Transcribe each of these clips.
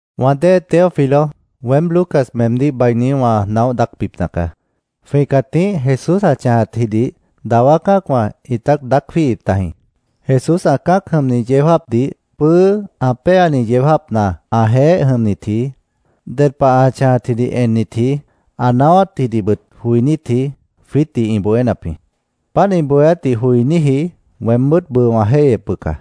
Wã dée Teófilo, weém Lucas meemdíh bainí wã naóh daácbipna caá. Jwĩ cãtíh Jesús ã chãjatjidih dawá cã́acwã ĩt daác jwíihip tajĩ. Jesús ã cã́ac jʉmni yeó jáapdih pʉ́ʉ́ ã péani yeó jáapna ãjeéh jʉmnitji, ded pah ã chãjatdih ennitji, ã naáwátdihbʉt joinítji, jwiítdih ĩ bohénap jĩ. Páant ĩ bohéátdih joiníji weembʉ́t bʉʉ wã jéihyep bʉca.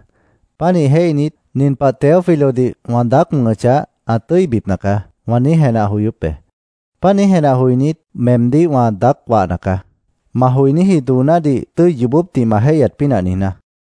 Pánih jéihnit, “Nin pah Teófilodih wã daác wʉ̃hʉchah, ã tʉ́ibipna caá”, wã niíj jenah joyóp be. Páant niíj jenah joinít, meemdíh wã daác wahna caá, ma joiníji doonádih tʉ́i yoobópdih ma jéihyat pínah niijná.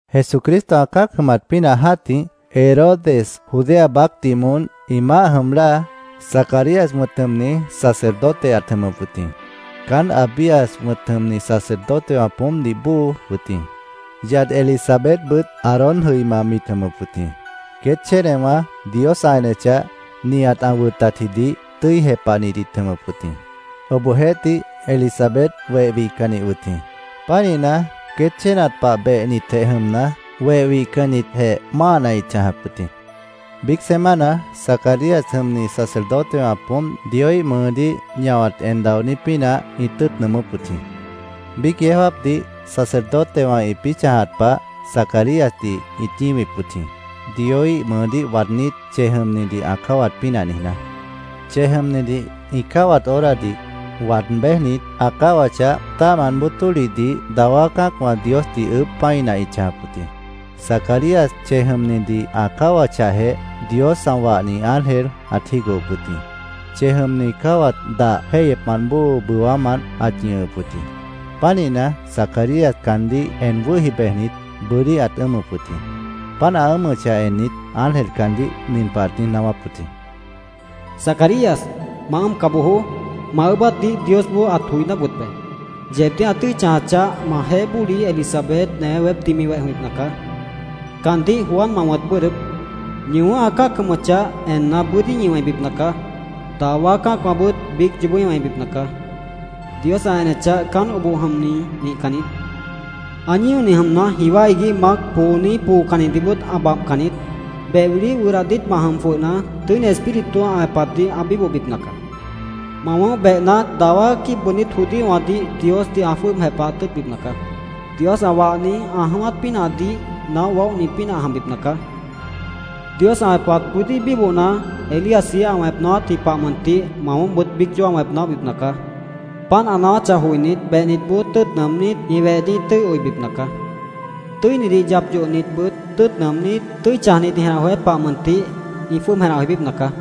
Jesucristo ã cã́ac jʉmat pínah jã́tih, Herodes Judea baácdih moón ĩ maáh jʉm láa, Zacarías wʉ̃t jʉmni sacerdote ãt jʉmʉp wʉt jĩ. Caán Abías wʉ̃t jʉmni sacerdotewã poómpdih bóo wʉt jĩ. Yad Elisabetbʉt Aarón jʉima mit jʉmʉp wʉt jĩ. Queét chénewã Dios ã enechah, nihat ã wʉtatjidih tʉ́i jepahnit ĩt jʉmʉp wʉt jĩ. Obohjeéhtih, Elisabet weh wihcannih wʉt jĩ. Pánihna, queét chénat pah behnitjeh jʉmna, weh wihcannitjeh máahna ĩt chãjap wʉt jĩ. Biíc semana Zacarías jʉmni sacerdotewã poómp Dioíh mʉʉdíh ñahwat en daonít pínah ĩt tʉ́ʉt nʉʉmʉ́p wʉt jĩ. Biíc yeó jáapdih sacerdotewã ĩpĩ́ chãjat pah, Zacaríasdih ĩt ñíwip wʉt jĩ, Dioíh mʉʉdíh waadnít, chej jʉmnidih ã cáwat pínah niijná. Chej jʉmnidih ĩ cáwat horadih waad béjnit, ã cáwachah, tã́ahmant bóo tólihdih dawá cã́acwã Diosdih ʉʉ́bh pã́ina ĩt chãjap wʉt jĩ. Zacarías chej jʉmnidih ã cáwachahjeh, Dios ã wahni ángel ãt jígohop wʉt jĩ. Chej jʉmni cáwat dah jéihyepmant bóo bʉwámant ãt ñʉhʉp wʉt jĩ. Pánihna, Zacarías caandíh en wʉ́hi bejnit, bʉ́dí ãt ʉ́ʉmʉp wʉt jĩ. Páant ã ʉ́ʉmʉchah ennit, ángel caandíh nin pah ãt niíj naáwáp wʉt jĩ: —Zacarías, ma ʉ́ʉmca bojoó. Ma ʉʉ́bátdih Diosboó ãt joiná wʉt be. Yeebdíh ã tʉ́i chãjachah, majeéh bóli, Elisabet, newé weépdih mi weh jʉmbipna caá. Caandíh Juan ma wʉ̃t bʉ́ʉdhdʉ́p. Ñi wʉ̃ʉ́h ã cã́ac jʉmʉchah enna, bʉ́dí ñi wẽibipna caá. Dawá cã́acwãbʉt biíc yoobó ĩ wẽibipna caá. Dios ã enechah, caán oboh jʉmni nihcan niít. Ã ñíoni jʉmna, jiwá iguíh mac, pooni, poocannidihbʉt ã babhcan niít. Beh wiliíh wʉdah diítmah jʉm jwʉhna, Tʉ́ini Espíritu ã wẽpatdih ã bíbohbipna caá. Ma wʉ̃ʉ́h behna, dawá quíib bʉʉdnít judíowãdih Diosdih ã jwʉ́ʉb jepahat tʉ́ʉtbipna caá. Dios ã wahni ã jʉ̃ʉ́wát pínahdih naóh waóhni pínah ã jʉmbipna caá. Dios ã wẽpat bʉ́dí bíbohna, Elíasji ã wẽp naáwátji pah mʉntih ma wʉ̃ʉ́hbʉt biíc yoobó wẽp naóhni ã jʉmbipna caá. Páant ã naáwáchah joinít, behnitboó tʉ́ʉt nʉʉmnít, ĩ wehdih ĩ tʉ́i oibipna caá. Tʉ́inidih yap yohnitbʉt tʉ́ʉt nʉʉmnít, tʉ́i chãjnit ĩ jenah joyát pah mʉntih ĩ jwʉ́ʉb jenah joibípna caá.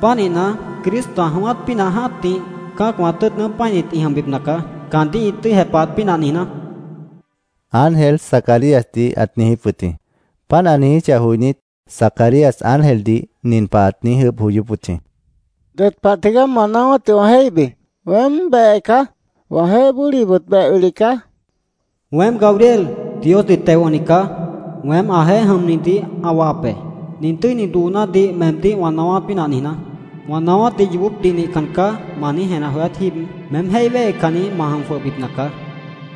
Pánihna, Cristo ã jʉ̃ʉ́wát pínah jã́tih, cã́acwã tʉ́ʉt nʉʉ́m pã́init ĩ jʉmbipna caá, caandíh ĩ tʉ́i jepahat pínah niijná, ángel Zacaríasdih ãt niijíp wʉt jĩ. Páant ã niijíchah joinít, Zacarías ángeldih nin pah ãt niíj ʉʉ́bh joyóp wʉt jĩ: —¿Ded pah tigaá ma naáwátdih wã jéihbi? Weém behe caá. Wãjeéh bólibʉt beh wili caá, ãt niijíp wʉt jĩ. —Weém Gabriel, Diosdih teo wʉ̃hni caá. Weém ãjeéh jʉmnidih ã wahap be, nin tʉ́ini doonádih meemdíh wã naáwát pínah niijná. Wã naáwátdih ‘Yoobópdih nihcan caá’, ma niíj jenah joyát jíib, meém jéih wéhecanni ma jʉm jwʉhbipna caá.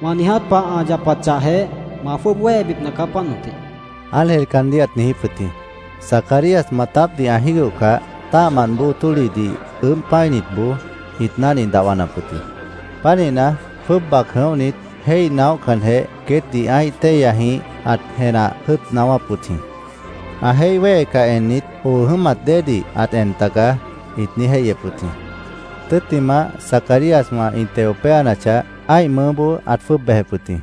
Wã niiját pah ã yapachahjeh, ma jwʉ́ʉb wéhebipna caá, páant mʉntih, ángel caandíh ãt niijíp wʉt jĩ. Zacarías maatápdih ã jígohcah, tã́ahmant bóo tólihdih ʉʉ́bh pã́initboó ĩt náhni dahwanap wʉt jĩ. Pánihna, jwʉ́ʉb bac jʉ̃óhnit, jéih naóhcanjeh, queétdih ã́ih téihyajĩh ãt jenah jʉ́ʉt naáwáp wʉt jĩ. Ã jéih wéhecah ennit, “Oo jʉ́mat déedih ãt en tagaá”, ĩt niíj jéihyep wʉt jĩ. Tʉ́ttimah, Zacaríaswã ĩ teo péanachah, ã́ih mʉʉ́boó ãt jwʉ́ʉb bejep wʉt jĩ.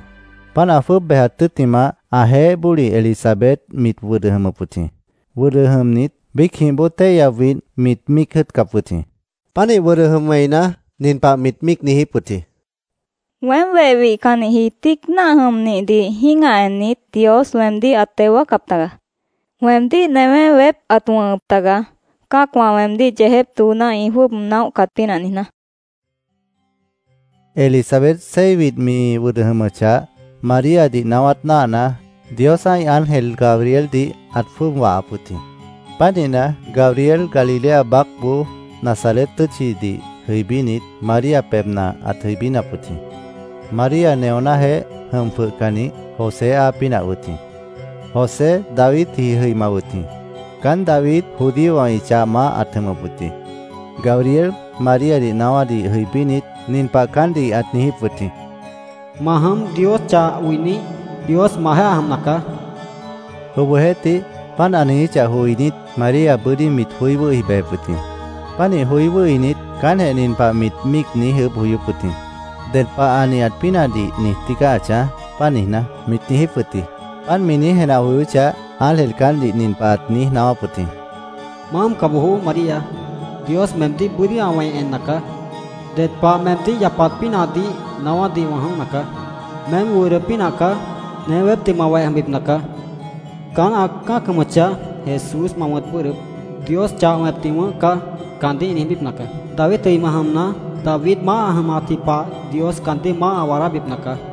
Páant ã jwʉ́ʉb bejat tʉ́ttimah, ãjeéh bóli Elisabet mit wʉdʉ jʉmʉp wʉt jĩ. Wʉdʉ jʉmnit, biícjĩh bóo téihya widh mit míic jʉ́ʉtcap wʉt jĩ. Pánih wʉdʉ jʉm wẽina, nin pah mit míic niijíp wʉt jĩ, “Weém weh wihcannihji tíic náah jʉmnihdih jĩ́gah ennit, Dios weemdíh ãt teo wáacap taga. Weemdíh newé weép ãt wʉ̃hʉp taga, cã́acwã weemdíh yeejép dooná ĩ jwʉ́ʉb naóhcat pínah niijná”, mit niijíp wʉt jĩ. Elisabet seis widh mi wʉdʉ jʉmʉchah, Maríadih naáwát náahna, Dios ã́ih ángel Gabrieldih ãt jwʉ́ʉb wahap wʉt jĩ. Pánihna, Gabriel Galilea baácboó Nazaret tʉ́tchidih jʉibínit, María pebhna ãt jʉibínap wʉt jĩ. María neonájeéh jʉm jwʉhcannih José áa pínah wʉt jĩ. José Davidji jʉima wʉt jĩ. Caán David judíowã ĩ chah maáh ãt jʉmʉp wʉt jĩ. Gabriel Maríadih naáwádih jʉibínit, nin pah caántdih ãt niijíp wʉt jĩ: —¿Ma jʉm, Dios chah oinih? Dios majeéh ã jʉmna caá, ãt niijíp wʉt jĩ. Obohjeéhtih, páant ã niijíchah joinít, María bʉ́dí mit joí wʉ́hi bejep wʉt jĩ. Pánih joí wʉ́hinit, caántjeh nin pah mit míic niíj ʉʉ́bh joyóp wʉt jĩ: “¿Ded pah ã nihat pínahdih niij tígaá ã chãj, páant niijná?” mit niijíp wʉt jĩ. Páant mi niíj jenah joyóchah, ángel caántdih nin pah ãt niíj naáwáp wʉt jĩ: —¡Ma ʉ́ʉmca bojoó, María! Dios meemdíh bʉ́dí ã wẽi enna caá. Ded pah meemdíh yapat pínahdih naáwádih wã jʉ̃óhna caá. Meém wʉdʉ pínah caá. Newé weépdih ma weh jʉmbipna caá. Caán ã cã́ac jʉmʉchah, Jesús ma wʉ̃t bʉ́ʉdhdʉ́p. ‘Dios chah wẽpni wʉ̃ʉ́h caá’, caandíh ĩ niijbípna caá. David jʉima jʉmna, David maáh ã jʉmatji pah Dios caandíh maáh ã waadábipna caá.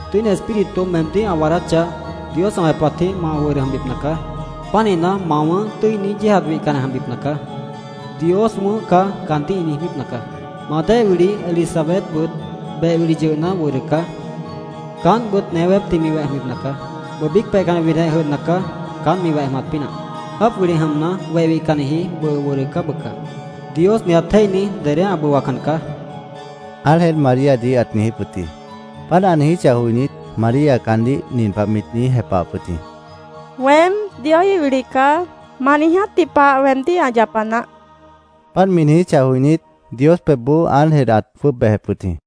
—Tʉ́ini Espíritu meemdíh ã waadáchah, Dios ã wẽpatjĩh ma wʉdʉ jʉmbipna caá. Pánihna, ma wʉ̃ʉ́h tʉ́ini, yéejat wihcanni ã jʉmbipna caá. ‘Dios wʉ̃ʉ́h caá’, caandíh ĩ niijbípna caá. Ma dée wili, Elisabetbʉt beh wili yʉhna, wʉdʉ caá. Caántbʉt newé weépdih mi weh jʉmbipna caá. Bʉʉ biíc peihcanni widhjeh jʉdhna caá, caánt mi weh jʉmat pínah. Jáap wili jʉmna, weh wihcannihji bʉʉ wʉdʉ caá bʉca. Dios nihat jéihni dedé ã bʉwacan caá, ángel Maríadih ãt niijíp wʉt jĩ. Páant ã niijíchah joinít, María caandíh nin pah mit niíj jepahap wʉt jĩ: —Weém Dioíh wili caá. Ma niijátji pah weemdíh ã yapa naáh, mit niijíp wʉt jĩ. Páant mi niijíchah joinít, Dios pebhboó ángel ãt jwʉ́ʉb bejep wʉt jĩ.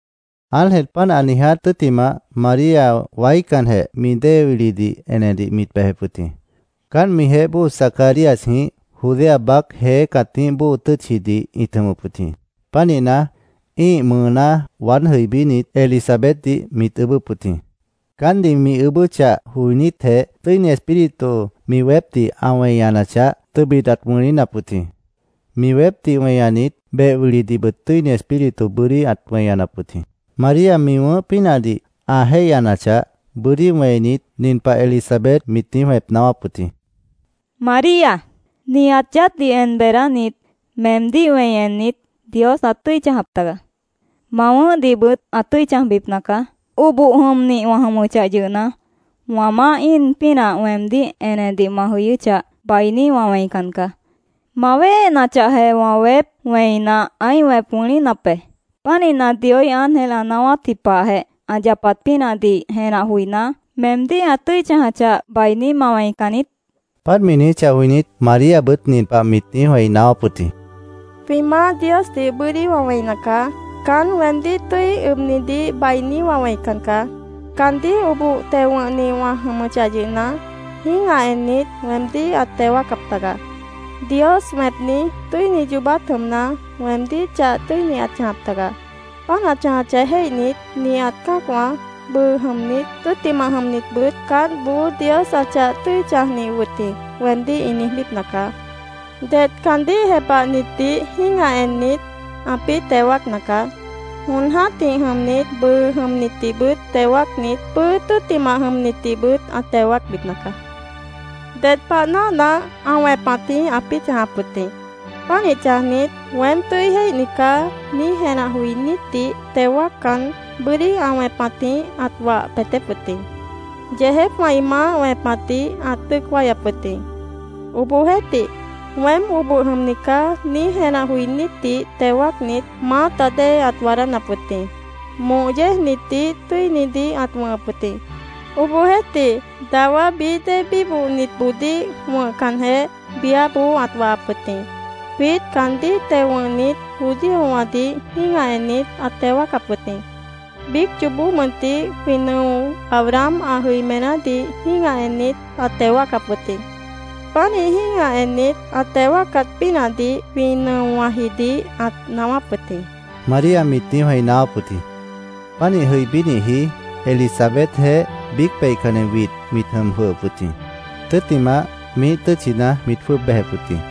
Ángel páant ã niiját tʉ́ttimah, María waícanjeh mi dée wilidih enedih mit bejep wʉt jĩ. Caánt mijeéh bóo Zacaríasjĩh Judea baác jeé cãtíh bóo tʉ́tchidih ĩt jʉmʉp wʉt jĩ. Pánihna, ĩ́ih mʉʉná waád jʉibínit, Elisabetdih mit ʉʉ́bʉ́p wʉt jĩ. Caántdih mi ʉʉ́bʉ́chah joinítjeh, Tʉ́ini Espíritu mi weépdih ã weñanachah, tʉbit ãt wʉ̃línap wʉt jĩ. Mi weépdih weñanit, beh wilidihbʉt Tʉ́ini Espíritu bʉ́dí ãt weñanap wʉt jĩ. María mi wʉ̃ʉ́h pínahdih ã jéihyanachah, bʉ́dí wẽinit, nin pah Elisabet mit niíj wẽp naáwáp wʉt jĩ: —María, nihat yaádhdih en beedánit, meemdíh wẽi ennit, Dios ãt tʉ́i chãjap taga. Ma wʉ̃ʉ́hdihbʉt ã tʉ́i chãjbipna caá. Oboh jʉmnih wã jʉmʉchah yʉhna, wã Maáh íin pínah weemdíh enedih ma jʉyʉ́chah, bainí wã wẽican caá. Ma wíhenachahjeh, wã weép wẽina, ãí wẽp wʉ̃línap be. Pánihna, Dioíh ángel ã naáwátji pahjeh ã yapat pínahdih jenah joiná, meemdíh ã tʉ́i chãjachah, bainí ma wẽican niít, mit niijíp wʉt jĩ. Páant mi niijíchah joinít, Maríabʉt nin pah mit wẽi niíj naáwáp wʉt jĩ: “Jwĩ Maáh Diosdih bʉ́dí wã wẽina caá. Caán weemdíh tʉ́i ʉbnidih bainí wã wẽican caá. Caandíh oboh teo wʉ̃hnih wã jʉmʉchah yʉhna, jĩ́gah ennit, weemdíh ãt teo wáacap taga. Dios wẽpni, tʉ́ini yoobát jʉmna, weemdíh chah tʉ́ini ãt chãjap taga. Páant ã chãjachah jéihnit, nihat cã́acwã, bʉʉ jʉmnit, tʉ́ttimah jʉmnitbʉt ‘Caántboó Dios ã chah tʉ́i chãjnih wʉt jĩ’, weemdíh ĩ niijbípna caá. Det caandíh jepahnitdih jĩ́gah ennit, ãpĩ́ teo wáacna caá. Jon jã́tih jʉmnit, bʉʉ jʉmnitdihbʉt teo wáacnit, pʉ́ʉ́ tʉ́ttimah jʉmnitdihbʉt ã teo wáacbipna caá. Ded pah náahna, ã wẽpatjĩh ãpĩ́ chãjap wʉt jĩ. Pánih chãjnit, ‘Weém tʉ́i jéihni caá’, niíj jenah joinítdih teo wáaccan, bʉ́dí ã wẽpatjĩh ãt wah peetép wʉt jĩ. Yeejépwã ĩ maáh wẽpatdih ãt dʉ́ʉc wáyap wʉt jĩ. Obohjeéhtih, ‘Weém oboh jʉmni caá’, niíj jenah joinítdih teo wáacnit, maáta dée ãt waadánap wʉt jĩ. Moh yéejnitdih tʉ́inidih ãt wʉ̃hʉp wʉt jĩ. Obohjeéhtih, dawá bií dée bíbohnitboodíh wʉ̃hcanjeh, biáboó ãt wahap wʉt jĩ. Jwiít caandíh teo wʉ̃hnit judíowãdih jĩ́gah ennit, ãt teo wáacap wʉt jĩ. Biíc yoobó mʉntih jwĩ nʉo Abraham ã jʉimenádih jĩ́gah ennit, ãt teo wáacap wʉt jĩ. Pánih jĩ́gah ennit, ã teo wáacat pínahdih jwĩ nʉowãjidih ãt naáwáp wʉt jĩ”, María mit niíj wẽi naáwáp wʉt jĩ. Pánih jʉibínihji Elisabetjeéh biíc peihcanni widh mit jʉm jwʉhʉp wʉt jĩ. Tʉ́ttimah, miíh tʉ́tchina mit jwʉ́ʉb bejep wʉt jĩ.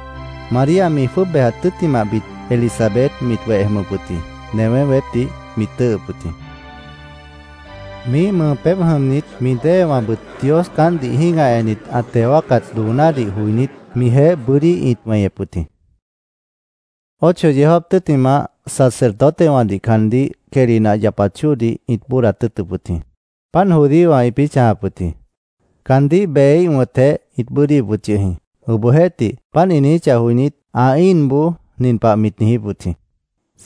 María mi jwʉ́ʉb bejat tʉ́ttimahbit, Elisabet mit weh jʉmʉp wʉt jĩ. Newé weépdih mit tʉ́ʉhʉp wʉt jĩ. Miíh mʉʉ pébh jʉmnit mi déewãbʉt Dios caántdih jĩ́gah ennit ã teo wáacat doonádih joinít, mijeéh bʉ́dí ĩt weñep wʉt jĩ. Ocho yeó jáap tʉ́ttimah, sacerdotewãdih caandíh quehli nah yapat chóodih ĩt bóodat tʉ́ʉtʉp wʉt jĩ. Páant judíowã ĩpĩ́ chãjap wʉt jĩ. Caandíh beheíh wʉ̃tjeh ĩt bʉ́ʉdhdíhip wʉt yʉh jĩ. Obohjeéhtih, páant ĩ niijíchah joinít, ã íinboó nin pah mit niijíp wʉt jĩ: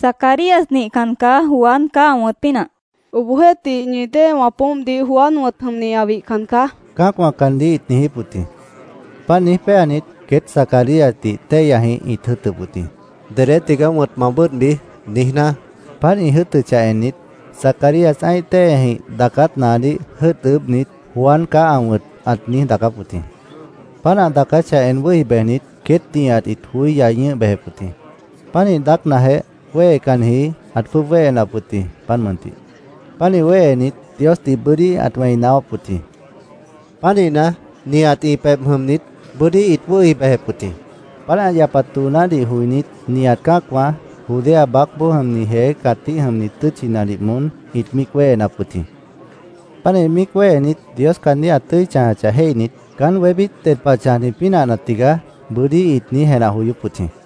—Zacarías nihcan caá. Juan caá ã wʉ̃t pínah, mit niijíp wʉt jĩ. —Obohjeéhtih, ñi déewã poómpdih Juan wʉ̃t jʉmni ã wihcan caá, cã́acwã caántdih ĩt niijíp wʉt jĩ. Páant niíj péanit, queét Zacaríasdih téihyajĩh ĩt jʉ́ʉtʉp wʉt jĩ, “¿Dedé tigaá wʉ̃t ma bʉ́ʉdhbi?” niijná. Páant ĩ jʉ́ʉtʉchah ennit, Zacarías ã́ih téihyajĩh daacát naadíh jʉ́ʉt ʉʉ́bhnit, “Juan caá ã wʉ̃t”, ãt niíj daacáp wʉt jĩ. Páant ã daacáchah en wʉ́hi bejnit, queét nihat ĩt joí yai ñʉ́h bejep wʉt jĩ. Pánih daácnajeh, wéhecanniji ãt jwʉ́ʉb wéhenap wʉt jĩ, páant mʉntih. Pánih wéhenit, Diosdih bʉ́dí ãt wẽi naáwáp wʉt jĩ. Pánihna, nihat ĩ pebh jʉmnit bʉ́dí ĩt wʉ́hi bejep wʉt jĩ. Páant ã yapat doonádih joinít, nihat cã́acwã, Judea baácboó jʉmni jeé cãtíh jʉmni tʉ́tchinadih moón ĩt míic wéhenap wʉt jĩ. Pánih míic wéhenit, Dios caandíh ã tʉ́i chãjachah jéihnit, “¿Caán wébít ded pah chãjni pínahna tigaá?” bʉ́dí ĩt niíj jenah joyóp wʉt jĩ.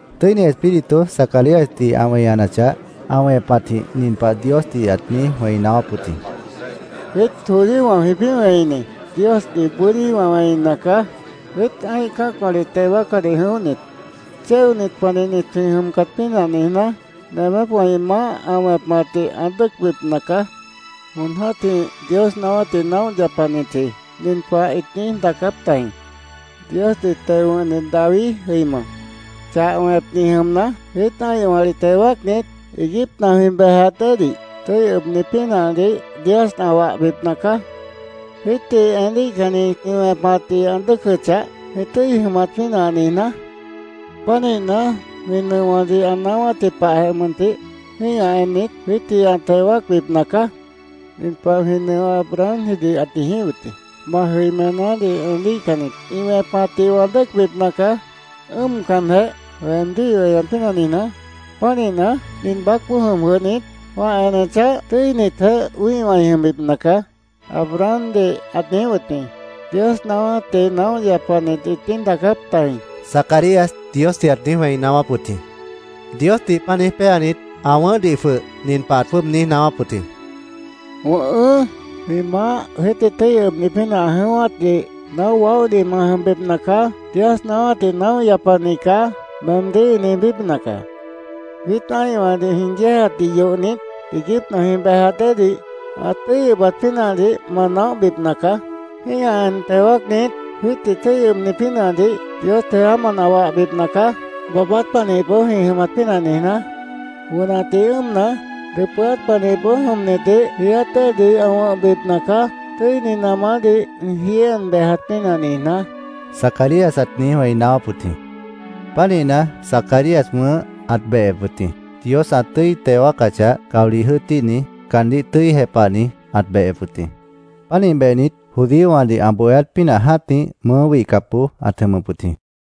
Tʉ́ini Espíritu Zacaríasdih ã weñanachah, ã wẽpatjĩh nin pah Diosdih ãt niíj wẽi naáwáp wʉt jĩ: “¡Jwiít judíowã jwĩpĩ́ wẽini Diosdih bʉ́dí wã wẽina caá! Jwiít ã́ih cã́acwãdih teo wáacadih jʉ̃óhnit, chéonit panihnit jwĩ jʉmcat pínah niijná, nemépwã ĩ maáh ã wẽpatdih ã dʉ́ʉcbipna caá. Jon jã́tih Dios naáwátdih naóh yapanitji nin pah ĩt niíj daacáp tajĩ: ‘Diosdih teo wʉ̃hni David jʉima chah wẽpni jʉmna, jwiít ã́ihwãdih teo wáacnit, iiguípna jwĩ bejat déedih tʉ́i ʉbni pínahdih Dios ã wahbipna caá, jwiítdih eníhcannit ĩ wẽpatdih ã dʉ́ʉcʉchah, jwĩ tʉ́i jʉmat pínah niijná. Pánihna, jwĩ nʉowãdih ã naáwátji pahjeh mʉntih, jĩ́gah ennit, jwiítdih ã teo wáacbipna caá. Nin pah jwĩ nʉo Abrahamjidih ãt niijíp wʉt jĩ: “Ma jʉimenádih eníhcannit ĩ wẽpatdih wã dʉ́ʉcbipna caá, ʉ́ʉmcanjeh, weemdíh ĩ weñat pínah niijná. Pánihna, nin baácboó jʉm jwʉhnit, wã enechah, tʉ́initjeh wĩ́ihwã ĩ jʉmbipna caá”, Abrahamdih ãt niijíp wʉt jĩ’, Dios naáwátdih naóh yapanit ĩt niíj daacáp tajĩ”, Zacarías Diosdih ãt niíj wẽi naáwáp wʉt jĩ. Diosdih páant niíj péanit, ã wʉ̃ʉ́hdih jwʉh nin pah ãt jwʉ́ʉb niíj naáwáp wʉt jĩ: “Wʉ̃ʉhʉ́, jwĩ Maáh jwiítdih tʉ́i ʉbni pínah ã jʉ̃ʉ́wátdih naóh waóhni ma jʉmbipna caá. ‘Dios naáwátdih naóh yapani caá’, meemdíh ĩ niijbípna caá. Jwiít ã́ihwãdih jwĩ yéejatdih yohnit, iiguípna jwĩ bejat déedih ã tʉ́i ʉbat pínahdih ma naóhbipna caá. Jĩ́gah en teo wáacnit, jwiítdih tʉ́i ʉbni pínahdih Dios jeámant ã wahbipna caá, baabát panihipboó jwĩ jʉmat pínah niijná. Wʉnatdih ʉ́ʉmna, dʉpʉ́át panihipboó jʉmnitdih jiiát déedih ã wʉ̃hbipna caá, tʉ́ini namádih ĩ jií en bejat pínah niijná”, Zacarías ãt niíj wẽi naáwáp wʉt jĩ. Pánihna, Zacarías wʉ̃ʉ́h ãt behep wʉt jĩ. Dios ã tʉ́i teo wáacachah, caolih jʉ́ʉtíhni, caandíh tʉ́i jepahni ãt behep wʉt jĩ. Pánih behnit, judíowãdih ã bohéát pínah jã́tih mʉʉ́ wihcapboó ãt jʉmʉp wʉt jĩ.